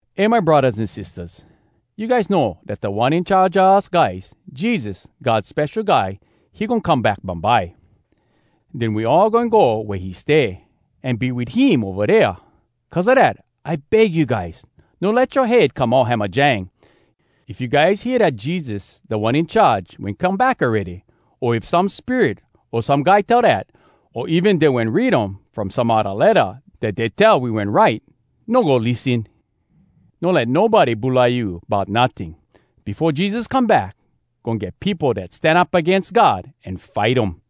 Eh my braddahs an sistahs, you guys know dat Da One In Charge a us guys, Jesus, God Spesho Guy, he goin come back bumbye. Den we all goin go wea he stay, an be wit him ova dea. Cuz a dat, I beg you guys, no let yoa head come all hamajang. If you guys hear dat Jesus, Da One In Charge, wen come back awready, o if some spirit o some guy tell dat, o even dey wen read um from some odda letta dat dey tell we wen write, no go lissen! No let nobody bulai you bout notting. Befo Jesus come back, goin get peopo dat stan up agains God an fight um.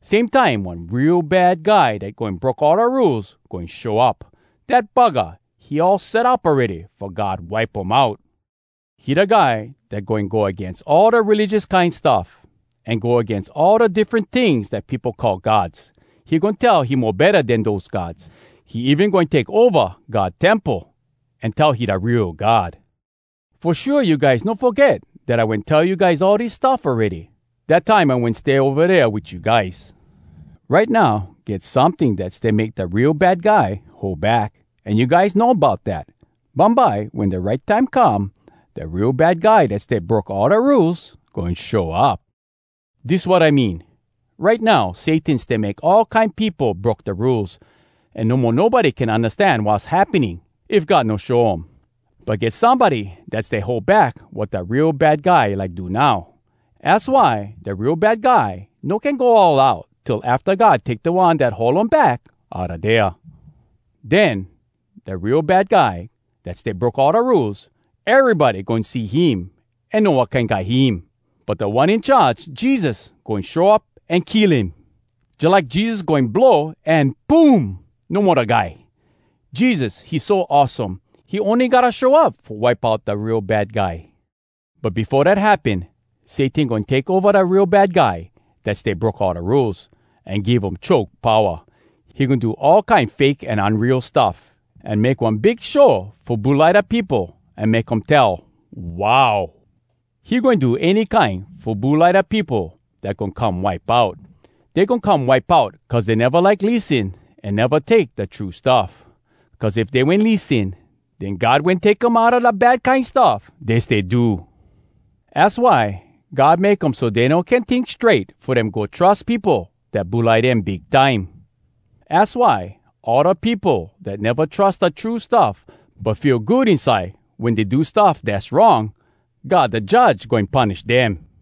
Same time, one Real Bad Guy dat goin broke all da rules goin show up. Dat buggah, he all set up awready fo God wipe um out. He da guy dat goin go agains all da religious kine stuff, an go agains all da diffren tings dat peopo call gods. He goin tell he mo betta den dose gods. He even goin take ova God temple an tell he da real God. Fo shua, you guys no foget dat I wen tell you guys all dis stuff awready, dat time I wen stay ova dea wit you guys. Right now, get someting dat stay make dat Real Bad Guy hold back, an you guys know bout dat. Bumbye, wen da right time come, da Real Bad Guy dat stay broke all da rules goin show up. Dis wat I mean: Right now, Satan stay make all kine peopo broke da rules, an no mo nobody can undastan wass happening if God no show um. But get somebody dat stay hold back wat da Real Bad Guy like do now. Az why da Real Bad Guy no can go all out till afta God take da one dat hold um back outa dea. Den, da Real Bad Guy dat stay broke all da rules, erybody goin see him an know wat kine guy him. But Da One In Charge, Jesus, goin show up an kill him. Jalike Jesus goin blow, an “poom!” no mo da guy. Jesus, he so awesome, he ony gotta show up fo wipe out da Real Bad Guy. But befo dat happen, Satan goin take ova da Real Bad Guy dat stay broke all da rules, an give um choke powa. He goin do all kine fake an unreal stuff, an make one big show fo bulai da peopo an make um tell, “Wow!” He goin do any kine fo bulai da peopo dat goin come wipe out. Dey goin come wipe out, cuz dey neva like lissen an neva take da true stuff. Cuz if dey wen lissen, den God wen take um outa da bad kine stuff dey stay do. Az why God make um so dey no can tink strait fo dem go trus peopo dat bulai dem big time. Az why all da peopo dat neva trus da true stuff, but feel good inside wen dey do stuff dass wrong, God da Judge goin punish dem.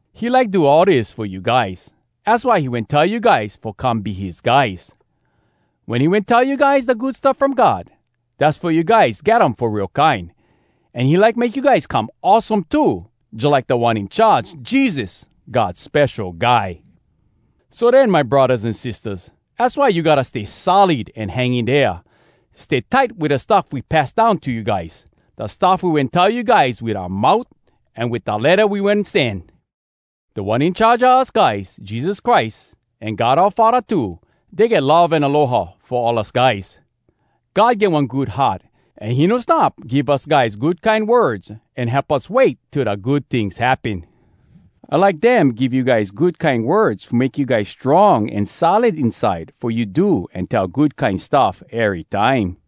He like do all dis fo you guys. Az why he wen tell you guys fo come be his guys. Wen we wen tell you guys da Good Stuff From God, dass fo you guys get um fo real kine. An he like make you guys come awesome too, jalike Da One In Charge, Jesus, God Spesho Guy. So den, my braddahs an sistahs, az why you gotta stay solid an hang in dea. Stay tight wit da stuff we pass down to you guys—da stuff we wen tell you guys wit oua mout, an wit da letta we wen sen. Da One In Charge a us guys, Jesus Christ, an God oua Faddah too, dey get love an aloha fo all us guys. God get one good heart, an he no stop give us guys good kine words an help us wait till da good tings happen. I like dem give you guys good kine words fo make you guys strong an solid inside fo you do an tell good kine stuff erytime.